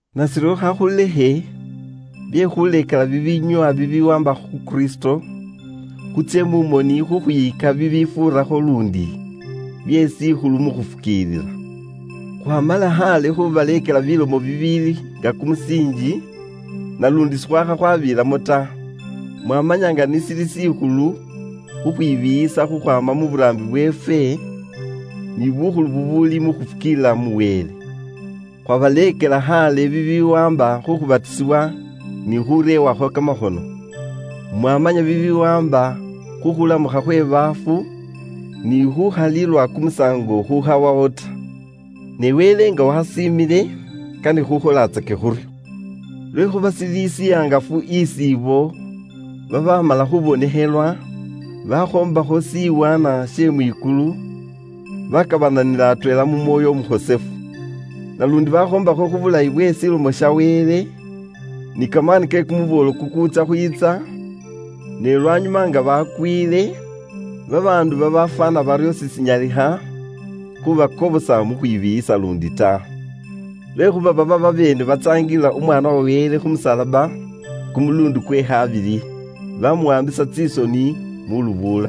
Nashiryo khakhulekhe bye khuuleekela bibinyoowa bibiwaamba khu Kristo, khutsye mu moni khukhwiyika bibifuurakho luundi bye shikhulu mu khufukiilila. Khwaamala khaale khubaleekela bilomo bibiili nga kumusiinji, naluundi sikhwakha khubiilamo ta. Mwamanya nga nashili shikhulu khukhwibiiyisa khukhwaama mu buraambi bweefwe ni bukhulu bubuuli mu khufukiilila mu Wele. Ifwe khwabaleekela inywe khaale bibiwaamba khu khupyeluusibwa ni khureewakho kamakhono. Mwamanya bibiwaamba khu khulamukha khwe baafu, ni khukhalilwa kumusaango khukhawawo ta. Ni Wele nga wasiimile, kane khukholatsake khuryo. Lwekhuuba shili shihangafu isi ibo babaamala khubonekhelwa, bakhoombakho shiwaanwa she mwikulu, bakabananila atweela mu Mwoyo Umukhosefu, naluundi bakhoombakho khu bulayi bwe Lomo ya Wele, ni kamaani ke kumuboolo kukuutsya khwiitsa, ne lwanyuma nga bakwiile, babaandu babafwaana baryo sishinyalikhana khuubakobosa mu khwibiiyisa luundi ta. Lwekhuuba baba babeene baatsaangilila Umwaana wa Wele khu musalaba kumuluundi kwe khabili, baamuwaambisa tsisoni mu lubuula.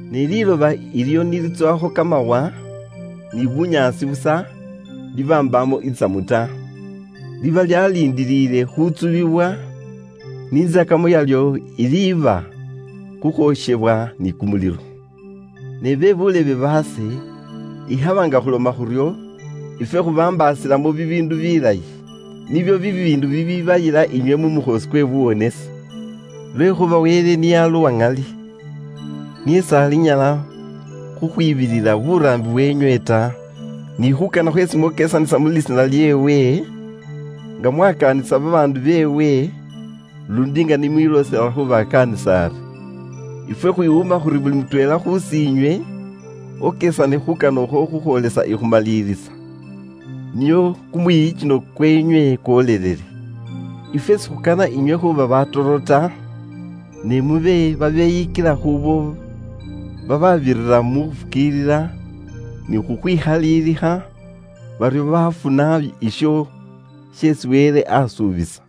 Ne liiloba ilyo ni litsowakho kamawa ni bunyaasi busa, liba mbaamo itsamu ta, liba lyaliindiilile khutsubiwa, ni intsakamo yalyo iliiba khukhwokhewa ni kumulilo. Ne bakanwa baase, ikhaba nga khuloma khuryo, ifwe khubambaasilamo bibiindu bilayi, nibyo bibiindu bibibayila inywe mu mukhoosi kwe buwonesi. Lwekhuuba Wele niye ali umwiyikinwa, niye s'alinyala khukhwibilila buraambi bweenywe ta, ni khuukana khweesi mwokesanisa mu lisiina lyeewe, nga mwakaanisa bakhosefu beewe, luundi nga ni mwiloosela khubakaanisa ari. Ifwe khwiwuuma khuri buli mutweela khus'inywe okesane khukana ukhwo khukhwoolesa ikhumalilisa, nio kumwiyikino kweenywe kwolelele. Ifwe sikhukana inywe khuuba batoro ta, ne mube babeyikila khuubo bababirira mu khufukiilila ni khukhwikhaliilikha, baryo baafuna isho sheesi Wele asuubisa.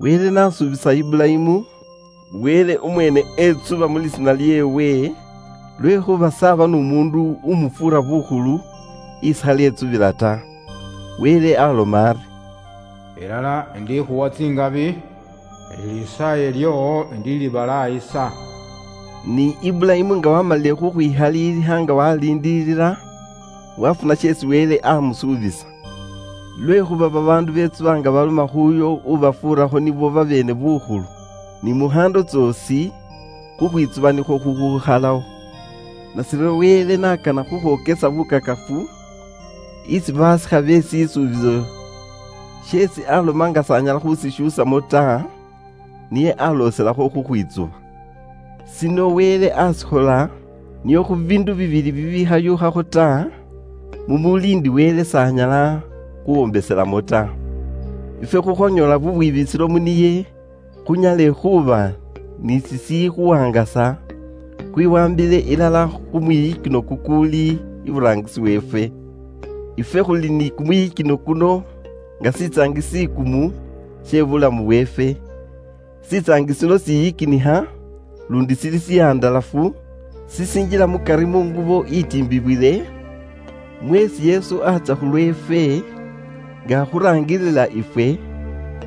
Wele n'asuubisa Iburayimu, Wele umweene etsuba mu lisiina lyeewe, lwekhuuba s'aba n'umuundu umufuura bukhulu isi khali etsubila ta. Wele aloma ari, “Ilala indikhuwa tsikhabi, ni lisaaye lyoowo indilibalaayisa.” Ni Iburayimu nga waamalile khukhwikhalilikha nga waliindilila, wafuna sheesi Wele amusuubisa. Lwekhuuba babaandu betsuba nga baloma khuuyo ubafuurakho nibo babeene bukhulu. Ni mukhaando tsoosi, khukhwitsuba nikhwo khukhukhalawo. Nashiryo Wele n'akana khukhwokesa bukakafu isi baasikha be shisuubiso sheesi aloma nga s'anyala khushishuusamo ta, niye aloselakho khukhwitsuba. Shino Wele ashikhola nio khu biindu bibili bibikhashuukha ta, mumuuli ndi Wele s'anyala khuwombeselamo ta, ifwe khukhwanyoola bubwibisilo mu niye khunyale khuuba ni shishikhuwaangasa khwiwaambile ilala khu mwiyikino kukuuli iburaangisi weefwe. Ifwe khuli ni kumwiyikino kuno nga shitsaangi she kamaani naluundi shishikhalimo khukhwikanakana ta, she buulamu bweefwe. Shitsaangi shino shiyikinikha luundi shili shihandalafu shishinjila mukari mu ngubo itiimbibwile, mweesi Yesu atsya khulweefwe, nga akhuraangilila ifwe,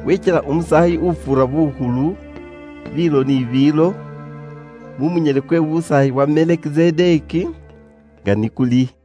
wekyela Umusaayi ufuura bukhulu, biilo ni biilo, mu munyele kwe busaayi kwa Melekizedeki nga ni kuli.